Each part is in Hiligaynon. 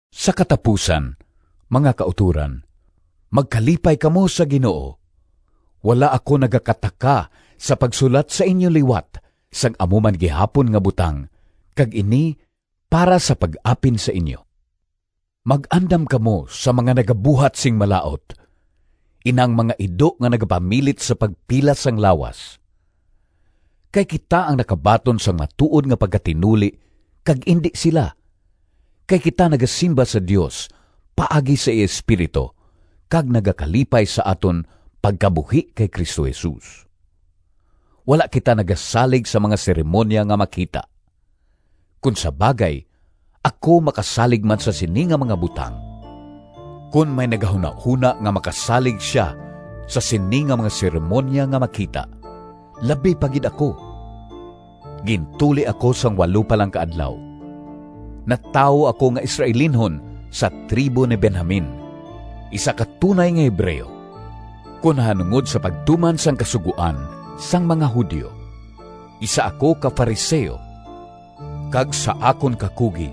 Sa katapusan, mga kautoran, magkalipay kamo sa Ginoo! Wala ako nagakataka sa pagsulat sa inyo liwat sang amo man gihapon nga butang, kag ini para sa pag-apin sa inyo. Mag-andam kamo sa mga nagabuhat sing malaut, inang mga ido nga nagapamilit sa pagpilas sang lawas. Kay kita ang nakabaton sang matuod nga pagkatinuli kag indi sila, kay kita nagasimba sa Dios paagi sa iya Espiritu, kag nagakalipay sa aton pagkabuhi kay Cristo Jesus. Wala kita nagasalig sa mga seremoniya nga makita. Kon sa bagay ako makasalig man sa sini nga mga butang. Kon may nagahunahona nga makasalig sia sa sini nga mga seremoniya nga makita, labi pa gid ako. Gintuli ako sang walo pa lang ka adlaw. Natawo ako nga Israelinhon, sa tribo ni Benjamin, isa ka tunay nga Hebreo. Kon nahanungod sa pagtuman sang Kasugoan sang mga Judio, isa ako ka Fariseo, kag sa akon kakugi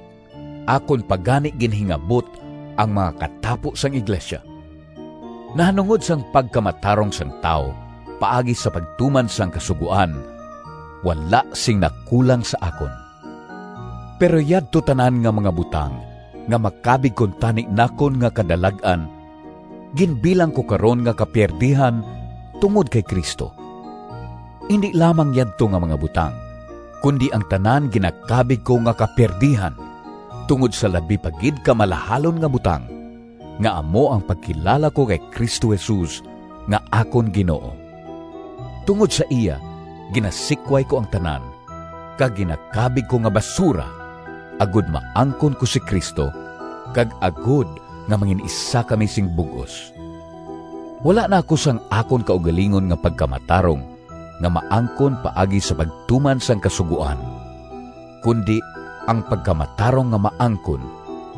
akon pa gani ginhingabot ang mga katapo sang iglesia. Nahanungod sang pagkamatarong sang tawo paagi sa pagtuman sang Kasugoan, wala sing nakulang sa akon. Pero yadto tanan nga mga butang nga makabig kuntani nakon nga kadalag-an, ginbilang ko karon nga kapiyerdihan tungod kay Cristo. Indi lamang yadto nga mga butang, kundi ang tanan ginakabig ko nga kapiyerdihan tungod sa labi pa gid ka malahalon nga butang, nga amo ang pagkilala ko kay Cristo Jesus nga akon Ginoo. Tungod sa iya ginasikway ko ang tanan, kag ginakabig ko nga basura, agod maangkon ko si Cristo, kag agod nga mangin-isa kami sing bug-os. Wala na ako sang akon kaugalingon nga pagkamatarong nga maangkon paagi sa pagtuman sang Kasugoan, kundi ang pagkamatarong nga maangkon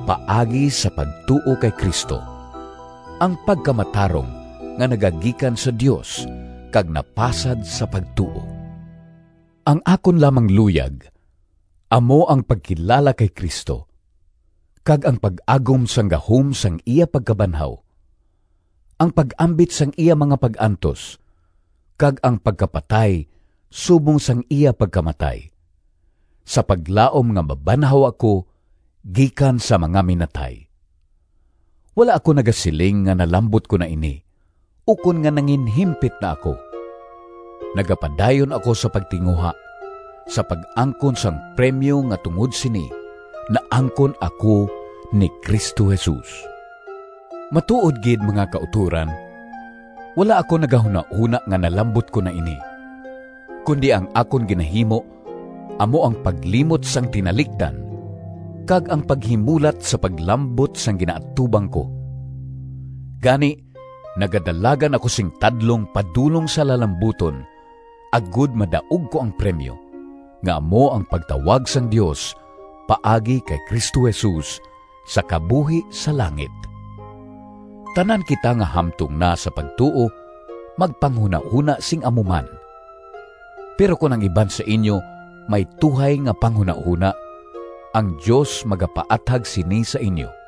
paagi sa pagtuo kay Cristo, ang pagkamatarong nga nagagikan sa Dios kag napasad sa pagtuo. Ang akon lamang luyag amo ang pagkilala kay Cristo, kag ang pag-agom sang gahom sang iya pagkabanhaw, ang pag-ambit sang iya mga pag-antos, kag ang pagkapatay subong sang iya pagkamatay, sa paglaom nga mabanhaw ako gikan sa mga minatay. Wala ako nagasiling nga nalambot ko na ini, ukon nga nanginhimpit na ako. Nagapadayon ako sa pagtinguha sa pag-angkon sang premyo nga tungod sini naangkon ako ni Cristo Jesus. Matuod gid, mga kautoran, wala ako nagahunahona nga nalambot ko na ini, kundi ang akon ginahimo amo ang paglimot sang tinalikdan kag ang paghimulat sa paglambot sang ginaatubang ko. Gani nagadalagan ako sing tadlong padulong sa lalambuton agod madaog ko ang premyo, nga amo ang pagtawag sang Dios paagi kay Cristo Jesus sa kabuhi sa langit. Tanan kita nga hamtong na sa pagtuo magpanghunahona sing amo man. Pero kon ang iban sa inyo may tuhay nga panghunahona, ang Dios magapaathag sini sa inyo.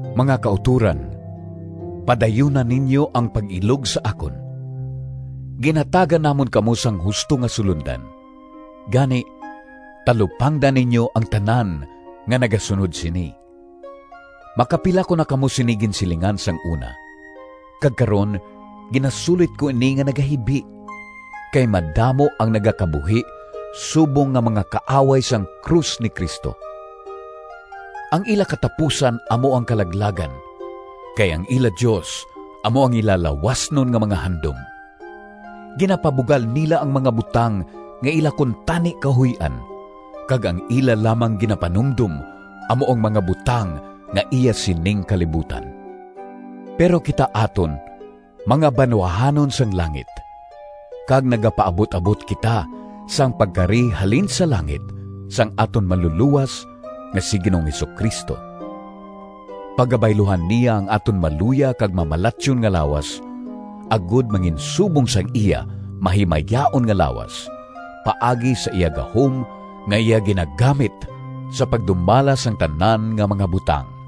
Mga kautoran, padayuna ninyo ang pag-ilog sa akon. Ginhatagan namon kamo sang husto nga sulondan, gani, talupangda ninyo ang tanan nga nagasunod sini. Makapila ko na kamo sini ginsilingan sang una, kag karon ginasulit ko ini nga nagahibi kay madamo ang nagakabuhi subong nga mga kaaway sang krus ni Cristo. Ang ila katapusan amo ang kalaglagan, kay ang ila dios amo ang ila lawasnon nga mga handom. Ginapabugal nila ang mga butang nga ila kuntani kahuy-an, kag ang ila lamang ginapanumdom amo ang mga butang nga iya sining kalibutan. Pero, kita aton mga banwahanon sang langit, kag nagapaabut-abot kita sang pagkari halin sa langit sang aton Manlulowas nga si Ginoong Jesu-Cristo. Pagabayluhan niya ang aton maluya kag mamalatyon nga lawas, agod manginsubong sang iya mahimayaon nga lawas paagi sa iya gahom nga iya ginagamit sa pagdumala sang tanan nga mga butang.